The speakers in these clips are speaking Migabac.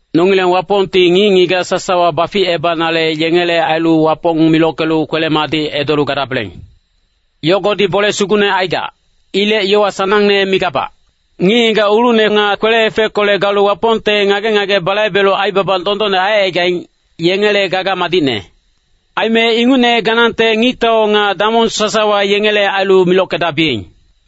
Nongileng Wapongti ngic-ngigac sasawa baficebanale yengele ailu Wapong milockelu kwele-madic edolu gadabeleng. Yogodi bole sugucne aigac. Ilec yowa sanangne migabac. Ngic-ngigac ulucne nga kwele-efeckolec galu Wapongte ngage-ngage balaibelu aibaba dondonne aicaigaing, yengele gaga madicne. Aime ingucne ganangte ngictau nga damong sasawa yengele ailu milockedabiyeng.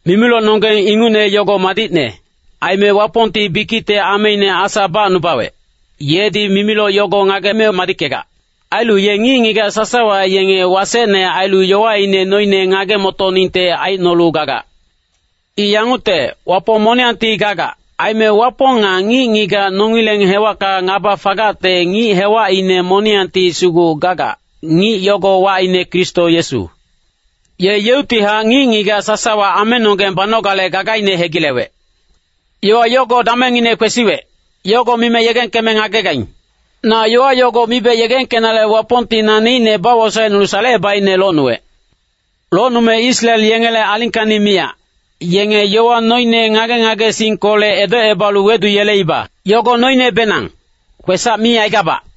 Mimilocnonggeng ingucne yogo madicne. Aime Wapongti bikicte ameine Asa bacnubawec, yedi mimiloc yogo ngageme madickegac. Ailu ye ngic-ngigac sasawa yenge wasecne ailu yowaine noine ngage-motoningte aicnolu gagac. I yangucte, Wapong moniyangti gagac. Aime Wapong nga ngic-ngigac nongileng hewacka ngaba fagacte ngic hewacine moniyangti sugu gagac, ngic yogo wacine Kristo Yesu. Ye yeuctihac ngic-ngigac sasawa amenonggeng banogale gagaine hegilewec. Yowa yogolec damengbenangine kwesiwec, yogo mime yegengkeme ngagegaing. Na yowa yogo mibe yegengkenale Wapongti naneicne bawosaecnulu salecebaicne locnuwec. Locnume Israel yengele alingkacni miyac, yenge yowa noine ngage-ngagesingkolec edocebalu weduyeleiba. Yogo noinebenang, kwesac mi aigabac.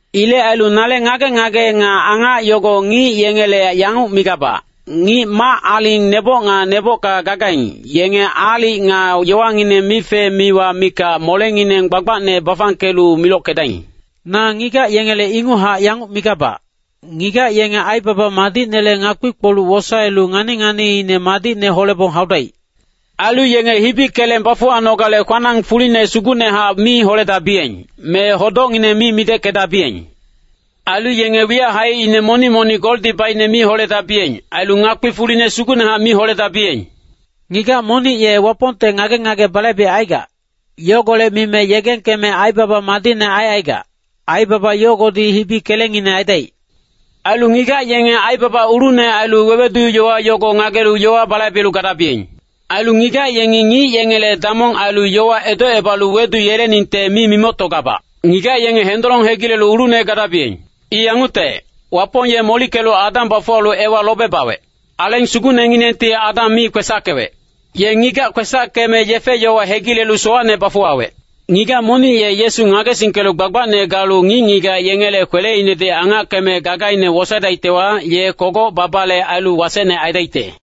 Ilec ailu nale ngage-ngage nga angac yogo ngic yengele yanguc migabac, ngic mac-aling neboc nga nebocka gagaing, yenge aalic nga yowangineng mife-miwa mikac molengineng gbagbacne bafangkelu milockedaing. Na ngigac yengele inguchac yanguc migabac, ngigac yenge aibaba madicnele ngakpi-kpoluc wosaelu ngani-nganiine madicne holebong haudaic. Ailu yenge hibi keleng bafuwanogale kwanang fuline sugucnehac mi holedabiyeng, me hodocngineng mi mideckedabiyeng. Ailu yenge wiyac haicine monic-monic goldi baicne mi holedabiyeng. Ailu ngakpi fuline sugucnehac mi holedabiyeng. Ngigac monic ye Wapongte ngage-ngage balaibecaigac, yogolec mime yegengkeme aibaba madicne aicaigac, aibaba yogodi hibi kelengngine aidaic. Ailu ngigac yenge aibaba ulucne ailu wewedu-yowa yogo ngagelu yowa balaibelu gadabiyeng. Ailu ngigac yengi ngic yengele damong ailu yowa edocebalu weduyeleningte mi mimoctogabac. Ngigac yenge hendolong hegilelu ulucne gadabiyeng. I yangucte, Wapong ye molickelu Adam bafuwalu Ewa lobe bawec. Aleng Sugucnenginengti Adam mi kwesackewec. Ye ngigac kwesackeme yefe-yowa hegilelu sowacne bafuwawec. Ngigac monic ye Yesu ngagesingkelu gbagbacne galu ngic-ngigac yengele kweleinedi angackeme gagaine wosaedaictewa, ye kogoc babale ailu wasecne aidaicte.